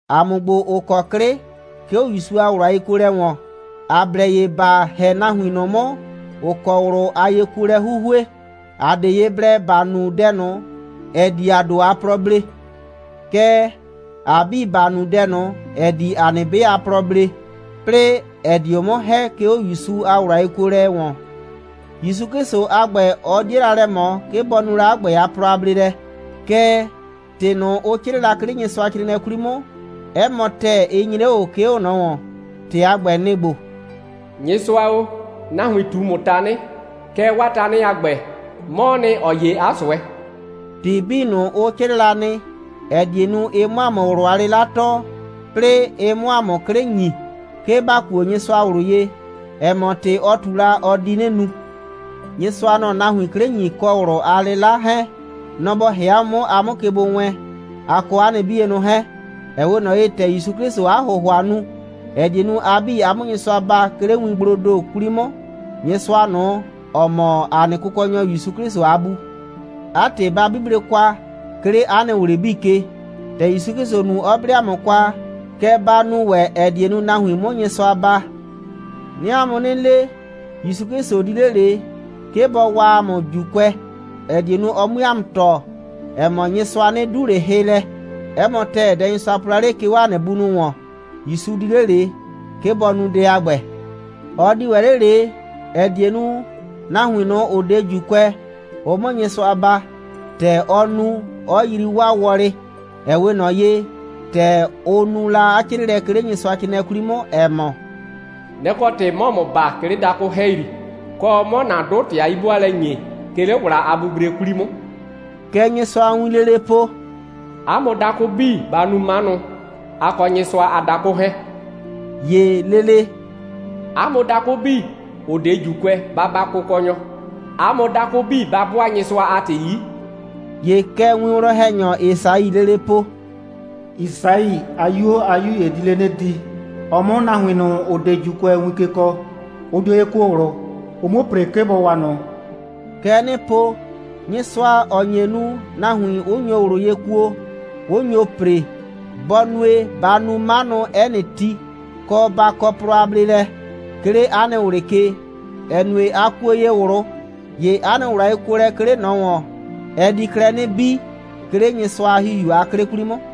‑A mʋ ‑gbo, ‑ʋ kɔ 'klɩ, 'ke 'o ‑Yusu a ꞊wlʋ a yekuolɛ ‑wɔn, ‑a blɛ ye ‑ba ‑hɛ nahuin ꞊nʋ 'mʋ, ‑ʋ kɔ ꞊wlʋ a yekuolɛ 'huhue. ‑A 'de ye blɛ ‑ba nu dɛ ꞊nʋ, ‑ɛ di ‑a ‑do a plɔ blee. Kɛɛ, ‑a 'bii, ‑ba nu dɛ ꞊nʋ, ‑ɛ di ‑a nɩ 'be a plɔ blee, 'plɩɩ, ‑ɛ dio 'mʋ ‑hɛ, 'ke 'o ‑Yusu a ꞊wlʋ a yekuolɛ ‑wɔn. ‑Yusu 'Klɩsʋ a ‑gbɛ, ɔ 'die la lɛ ꞊mɔ, 'ke bɔ nu la 'a ‑gbɛ a plɔ a bleelɛ. Kɛɛ, ‑tɩ ꞊nʋ, ʋ 'crɩɩ la, 'ke 'le Nyɩsʋacrɩɩnɩɛ 'kwli 'mʋ, 'ɛ mɔ ‑tɛɛ, ɩ nyre 'o ꞊o, 'ke 'o ꞊nɔ ‑wɔn. ‑Tɩ a ‑gbɛ, nɩ‑ ‑gbo: «Nyɩsʋa o, nahuin ꞊tu ‑mʋ tanɩ, kɛɛ, 'waa tanɩ a ‑gbɛ, 'mɔɔ nɩ, ‑ɔ 'ye 'a ꞊sʋɛ.» ‑Tɩ 'bii ꞊nʋ, ʋ 'crɩɩ la nɩ, ‑ɛ die nu, ɩ 'mʋ ‑a mʋ ꞊wlʋ a 'lɩla tɔɔ, 'plɩɩ ɩ 'mʋ ‑a mʋ 'klɩ ‑nyi, 'ke ‑ba kuo Nyɩsʋa ꞊wlʋ ye, ‑ɛ mɔ, ‑tɩ, ɔ ꞊tu la, ɔ di 'nɩ nu. Nyɩsʋa, nɔ‑ɔ nahuin 'klɩ ‑nyi kɔ ꞊wlʋ a 'lɩla 'hɛɛn. Nɔ‑ bɔ ‑hɛ 'a mʋ 'mʋ, a 'mʋ ke gbo wɛɛn, a kɔ 'a nɩ 'bienʋ 'hɛɛn, ‑ɛ 'we ꞊nɔ ye, ‑tɛ ‑Yusu 'Klɩsʋʋ 'a ‑hʋhʋa nu, ‑ɛ die nu, a 'bii, a 'mʋ Nyɩsʋa baa, 'ke 'le wingbloo ‑do 'kwli 'mʋ, Nyɩsʋa ꞊nʋ, ‑ɔ mɔ ‑a nɩ Kʋkɔnyɔ ‑Yusu 'Klɩsʋ a Bu. 'A ‑tɩ, ba 'buble kwa, 'ke 'le 'a nɩ ꞊wlɩ 'bii ke, ‑tɛ ‑Yusu 'Klɩsʋ nu, 'ɔ 'ble 'a mʋ kwa, kɛ ba nu ‑wɛ, ‑ɛ die nu, nahuin 'mʋ Nyɩsʋa baa. 'Nɩɩ 'a mʋ 'nɩ le, ‑Yusu 'Klɩsʋ di 'le ꞊le, 'ke bɔ waa ‑a mʋ ‑Juukʋɛ, ‑ɛ die nu, ɔ 'mue ‑a mʋ tɔɔ, ‑ɛ mɔ, Nyɩsʋa 'nɩ 'du ꞊le hɩ lɛ. 'Ɛ mɔ ‑tɛɛ, dɛ Nyɩsʋa po la 'le, 'ke 'o ‑a nɩ bunʋ ‑wɔn, ‑Yusu di 'le ꞊le, 'ke bɔ nu dɛ a ‑gbɛ. Ɔ di ‑wɛ 'le ꞊le, ‑ɛ die nu, nahuin, ‑ʋ 'de ‑Juukʋɛ, ʋ 'mʋ Nyɩsʋa baa, ‑tɛ ɔ nu, 'ɔ yrii 'waa wɔlɩ, ‑ɛ 'we ꞊nɔ ye, ‑tɛ ʋ nu la 'a 'crɩɩlɛ, 'ke 'le Nyɩsʋacrɩɩnɩɛ 'kwli 'mʋ, ‑ɛ mɔ: «Nɛ‑ kɔ ‑tɩ, 'mɔɔ ‑mʋ baa, 'ke 'le dakʋ ‑hɛyri, kɔ, 'mɔɔ ‑na 'dʋ ‑tɩ a 'yi'bʋaalɛ ‑nyi, 'ke 'le ‑wla a bibre 'kwli 'mʋ.» Kɛ Nyɩsʋa a wiin lele po: «'A mʋ dakʋ 'bii, ba nu 'manʋ, a kɔ Nyɩsʋa a dakʋ 'hɛɛn.» ‑Ye lele: «'A mʋ dakʋ 'bii, ‑ʋ 'de ‑Juukʋɛ, ba baa Kʋkɔnyɔ. 'A mʋ dakʋ 'bii, ba 'bʋaa Nyɩsʋa a ‑tɩ 'yi.» ‑Ye kɛ winwlɔn‑hɛnyɔ Esaii lele po: «Yisai a 'yuo a 'yu ‑ye di 'le 'nɩ di, ɔ 'mʋ nahuin ꞊nʋ, ‑ʋ 'de ‑Juukʋɛ win ke kɔɔ. Ʋ dio ye kuo ꞊wlʋ, ʋ 'muo ‑pre, 'ke bɔ waa ꞊nʋ.» Kɛ 'nɩɩ po: Nyɩsʋa, ‑ɔ nye nu, nahuin 'ʋ nyo ꞊wlʋ ye kuo, 'ʋ nyo ‑pre, bɔ nue, ba nu 'manʋ 'ɛ nɩ ti, kɔ, ba kɔ plɔ a bleelɛ, 'ke 'le 'a nɩ ꞊wlɩ ke, ‑ɛ nue, a kuo ye ꞊wlʋ. ‑Ye 'a nɩ ꞊wlʋ a yekuolɛ, 'ke 'le ꞊nɔ ‑wɔn, ɛ di klɛ 'nɩ bii, 'ke 'le Nyɩsʋa a ‑Hihiu a 'klɩ 'kwli 'mʋ.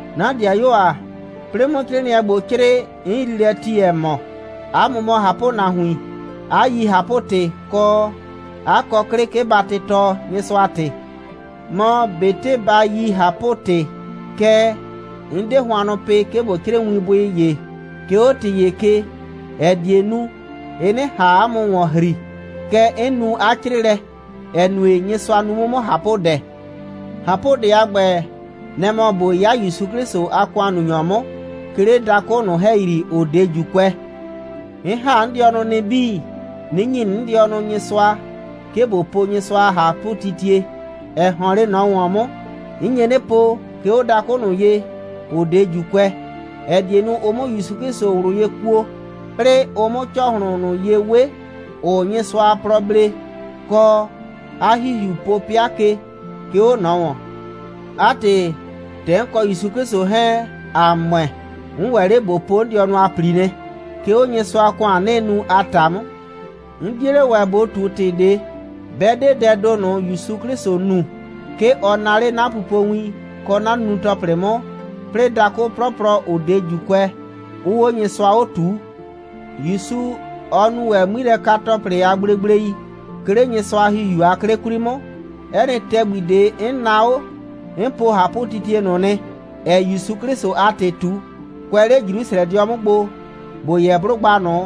'Na ‑dɩayuo ‑a, 'plɩɩ 'mʋ 'crɩɩnɩɛ ‑gbo 'crɩɩ, 'n yrii lɛ ti, ‑ɛ mɔ, 'a mʋ mɔ ꞊hapʋnahuin, 'a yi ꞊hapʋ‑tɩ, kɔ, 'a kɔ 'klɩ, 'ke ba tɩtɔɔ Nyɩsʋa a ‑tɩ. Mɔ ꞊betɩ ba yi ꞊hapʋ‑tɩ, kɛɛ, 'n 'de hʋannʋ pɩ, 'ke ꞊bo 'crɩɩ winbʋɩ ‑ye, 'ke 'o ‑tɩ ‑ye ke, ‑ɛ die nu, ɩ 'nɩ ꞊han 'a mʋ ‑wɔn ‑hri. Kɛ 'n nu 'a 'crɩɩlɛ, ‑ɛ nue, Nyɩsʋa nu 'mʋ 'mʋ ꞊hapʋdɛ. ꞊Hapʋdɛ a ‑gbɛ, nɛ‑ mɔ ꞊bo 'ya ‑Yusu 'Klɩsʋ a ‑kʋannunyɔ 'mʋ, 'ke 'le dakʋ ꞊nʋ ‑hɛyri, ‑ʋ 'de ‑Juukʋɛ. 'N ‑ha 'n dɩɔnʋ nɩ 'bii, 'nɩ ‑nyi 'n dɩɔnʋ Nyɩsʋa, 'ke ꞊bo po Nyɩsʋa a ꞊hapʋtitie, ‑ɛ ‑hɔn 'le ꞊nɔ ‑wɔn 'mʋ. 'N nye 'nɩ po, 'ke 'o dakʋ ꞊nʋ ye, ‑ʋ 'de ‑Juukʋɛ, ‑ɛ die nu, ʋ 'mʋ ‑Yusu 'Klɩsʋ ꞊wlʋ ye kuo, 'plɩɩ ʋ 'mʋ ‑cɔhlʋn ꞊nʋ ye 'we, ‑ʋʋ Nyɩsʋa a plɔ blee, kɔ, 'a ‑Hihiu po 'pɩa ke, 'ke 'o ꞊nɔ ‑wɔn. 'A ‑tɩ, ‑tɛ 'n kɔ ‑Yusu 'Klɩsʋ 'hɛɛn, ‑a ‑mʋɛ, 'n ‑wɛ 'le ꞊bo po 'n dɩɔnʋ a ‑pli nɩ, 'ke 'o Nyɩsʋa a ‑kʋan, 'nɩɩ nu a ‑ta 'mʋ. 'N 'die 'le ‑wɛ ꞊bo ꞊tu ‑tɩ ꞊de, 'bɛ 'de dɛɛ ‑do ꞊nʋ, ‑Yusu 'Klɩsʋ nu. 'Ke ɔ naa 'le 'na pupowin kɔ 'na nunu‑tɔplɩ 'mʋ, 'plɩɩ dakʋ 'plɔplɔ, ‑ʋ 'de ‑Juukʋɛ, 'ʋʋ 'o Nyɩsʋa 'o ꞊tuu. ‑Yusu, ɔ nu ‑wɛ 'ŋmilɛka‑tɔplɩ a gblegblei, 'ke 'le Nyɩsʋa a ‑Hihiu a 'klɩ 'kwli 'mʋ. 'Ɛ nɩ ‑tɛgbi ꞊de, 'n naa 'o, 'n po ꞊hapʋtitie ꞊nʋ nɩ, ‑ɛɛ ‑Yusu 'Klɩsʋ a ‑tɩ ꞊tu, kʋɛ 'le Jrusrɛdɩɔ 'mʋ gbo, ‑bo yɛ 'blʋgba ꞊nʋ,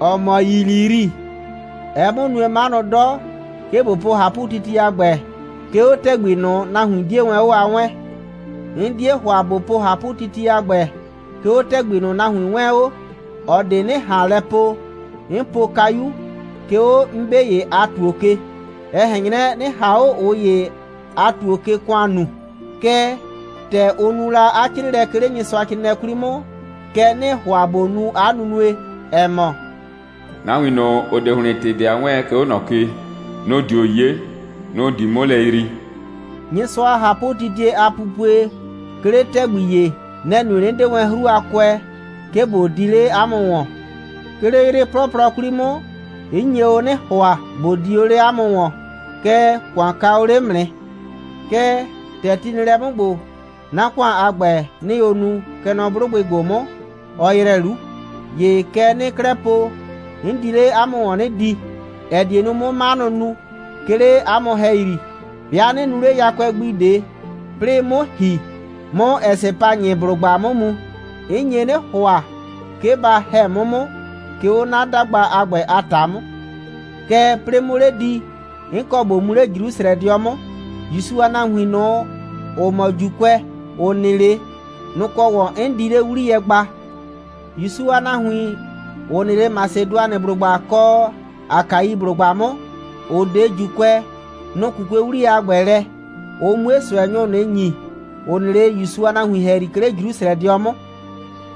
‑ɔ mɔ Yiliyri. Ɛɛ 'mʋ nue 'manʋ 'dɔ, 'ke ꞊bo po ꞊hapʋtitie a ‑gbɛ, 'ke 'o ‑tɛgbi ꞊nʋ, nahuin 'die wɛn 'o a 'wɛɛn. 'N 'die ‑hʋa, ꞊bo po ꞊hapʋtitie a ‑gbɛ, 'ke 'o ‑tɛgbi ꞊nʋ, nahuin 'wɛɛn 'o, ꞊ɔ ꞊de 'nɩ ꞊han lɛ po, 'n po kayu, 'ke 'o 'n 'be ‑ye a ‑tuo ke, ‑ɛ ꞊hɛn 'nyrɛ, 'nɩ ꞊han 'o ꞊ʋ ‑ye a ‑tuo ke ‑kʋan nuu. Kɛɛ, ‑tɛ ʋ nu la 'a 'crɩɩlɛ, 'ke 'le Nyɩsʋacrɩɩnɩɛ 'kwli 'mʋ, kɛ 'nɩɩ ‑hʋa ꞊bo nu 'a nunue, ‑ɛ mɔ: «Nahuin ꞊nʋ, ‑ʋ 'de ‑hlɩn ‑tɩ ꞊de a 'wɛɛn, 'ke 'o ꞊nɔ ke, nʋ‑ dio 'ye, nʋ‑ di 'mʋ lɛ yrii.» Nyɩsʋa a ꞊hapʋtitie a pupue, 'ke 'le ‑tɛgbi ‑ye, nɛ‑ nue, 'nɩ 'de wɛn 'hru a kʋɛ, 'ke ꞊bo di 'le 'a mʋ ‑wɔn. 'Ke 'le 'yrɩ 'plɔplɔ 'kwli 'mʋ, 'n nye o 'nɩ ‑hʋa, ꞊bo di o 'le 'a mʋ ‑wɔn, kɛɛ, ‑kʋan ka o 'le 'mʋ nɩ. Kɛɛ, ‑tɛ ti nɩ lɛ 'mʋ ‑gbo, 'na ‑kʋan a ‑gbɛ, 'nɩɩ o nu, kɛ nɔ 'blʋgbɩ ‑gbo 'mʋ, ɔ ‑yrɛ 'lu. ‑Ye kɛ 'nɩɩ 'klɛɛ po, 'n di 'le 'a mʋ ‑wɔn 'nɩ di, ‑ɛ die nu, 'mʋ 'manʋ nu, 'ke 'le 'a mʋ ‑hɛyri. 'Bɩa 'nɩ nuu 'le yakʋɛ gbi ꞊de, 'plɩɩ 'mʋ ‑hi, 'mʋ Ɛsɩpanyɩblʋgba 'mʋ mu. 'N nye 'nɩ ‑hʋa, 'ke ba ‑hɛ 'mʋ 'mʋ, 'ke 'o 'na 'dagba a ‑gbɛ a ‑ta 'mʋ. Kɛɛ, 'plɩɩ 'mʋ 'le di, 'n kɔ ꞊bo mu 'le Jrusrɛdɩɔ 'mʋ. ‑Yusu a nahuin ꞊nʋ, ‑ʋ mɔ ‑Juukʋɛ, ‑ʋ nɩ 'le, nʋ‑ kɔ ‑wɔn 'n di 'le 'wliyɛ gba. ‑Yusu a nahuin, ‑ʋ nɩ 'le Masedʋanɩblʋgba kɔ Akaiblʋgba 'mʋ, ‑ʋ 'de ‑Juukʋɛ, nʋ‑ 'kukue 'wliyɛ a ‑gbɛ lɛ, ʋ 'mue ꞊sʋɛnyʋ ꞊nʋ ‑nyi, ‑ʋ nɩ 'le ‑Yusu a nahuin ‑hɛyri, 'ke 'le Jrusrɛdɩɔ 'mʋ.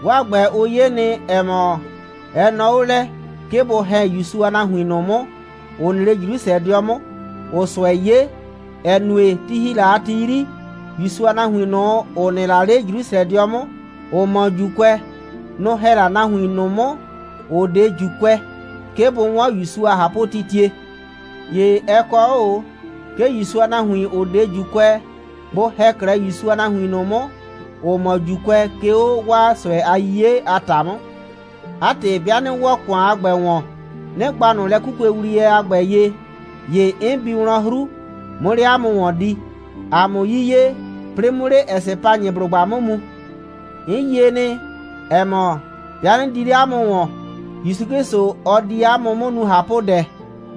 'Waa ‑gbɛ, ʋ 'ye nɩ, ‑ɛ mɔ, ɛ nɔɔ 'o lɛ, 'ke bʋ ‑hɛ ‑Yusu a nahuin ꞊nʋ 'mʋ, ‑ʋ nɩ 'le Jrusrɛdɩɔ 'mʋ, ‑ʋʋ ꞊sʋɛ 'ye, ‑ɛ nue, ti ‑hi la a ti 'yri, ‑Yusu a nahuin ꞊nʋ, ‑ʋ nɩ 'le Jrusrɛdɩɔ 'mʋ, ‑ʋ mɔ ‑Juukʋɛ, nʋ‑ ‑hɛ la nahuin ꞊nʋ 'mʋ, ‑ʋ 'de ‑Juukʋɛ, 'ke bʋ 'wɔn ‑Yusu a ꞊hapʋtitie. ‑Ye ɛ kɔ 'o ꞊o, 'ke ‑Yusu a nahuin, ‑ʋ 'de ‑Juukʋɛ, bʋ ‑hɛ 'klɛɛ ‑Yusu a nahuin ꞊nʋ 'mʋ, ‑ʋ mɔ ‑Juukʋɛ, 'ke 'o 'waa ꞊sʋɛ a 'yiye a ‑ta 'mʋ. 'A ‑tɩ, 'bɩa 'nɩ ‑wɔ ‑kʋan a ‑gbɛ ‑wɔn, 'nɩ gba ꞊nʋ lɛ'kukuewliyɛ a ‑gbɛ ye, ‑ye 'n bi wlɔn 'hru, 'mʋ 'le 'a mʋ ‑wɔn di, ‑a 'mʋ 'yiye, 'plɩɩ 'mʋ 'le Ɛsɩpanyɩblʋgba 'mʋ mu. 'N yie nɩ, ‑ɛ mɔ, 'bɩa 'nɩ di 'le 'a mʋ ‑wɔn, ‑Yusu 'Klɩsʋ, ɔ di ‑a mʋ 'mʋ nu ꞊hapʋdɛ,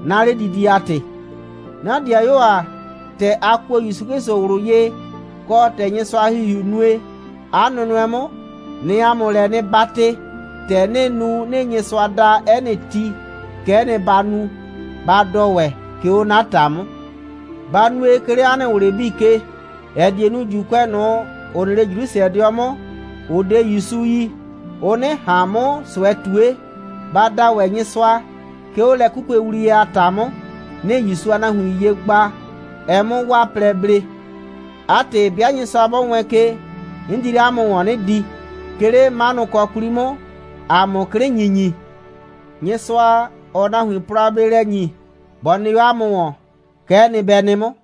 'na 'ledidie a ‑tɩ. 'Na ‑dɩayuo ‑a, ‑tɛ ‑a kuo ‑Yusu 'Klɩsʋ ꞊wlʋ ye, kɔ, ‑tɛ Nyɩsʋa a ‑Hihiu nue, ꞊a nʋnʋɛ 'mʋ, 'nɩɩ 'a mʋ lɛ 'nɩ 'batɩ, ‑tɛ 'nɩɩ nu, 'nɩɩ Nyɩsʋa da 'ɛ nɩ ti, kɛ'ɛ nɩ ba nu, ba dɔ ‑wɛ, 'ke 'o 'na ‑ta 'mʋ. Ba nue, 'ke 'le 'a nɩ ꞊wlɩ 'bii ke, ‑ɛ die nu, ‑Juukʋɛ ꞊nʋ, ‑ʋ nɩ 'le Jrusrɛdɩɔ 'mʋ, ‑ʋ 'de ‑Yusu yi, ʋ 'nɩ ꞊han 'mʋ ꞊sʋɛ ꞊tue. Ba da ‑wɛ Nyɩsʋa, 'ke 'o lɛ'kukuewliyɛ a ‑ta 'mʋ, 'nɩɩ ‑Yusu a nahuin ye gba, ɛ 'mʋ 'waa plɛ blee. 'A ‑tɩ, 'bɩa Nyɩsʋa 'bɔ wɛɛn ke, 'n di 'le 'a mʋ ‑wɔn 'nɩ di, 'ke 'le 'manʋkɔ 'kwli 'mʋ, ‑a 'mʋ 'klɩ ‑nyinyi. Nyɩsʋa, ‑ɔɔ nahuin plɔ a bleelɛ ‑nyi, bɔ nɩ 'o 'a mʋ ‑wɔn. Kɛ'ɛ nɩ, bɛ nɩ 'mʋ.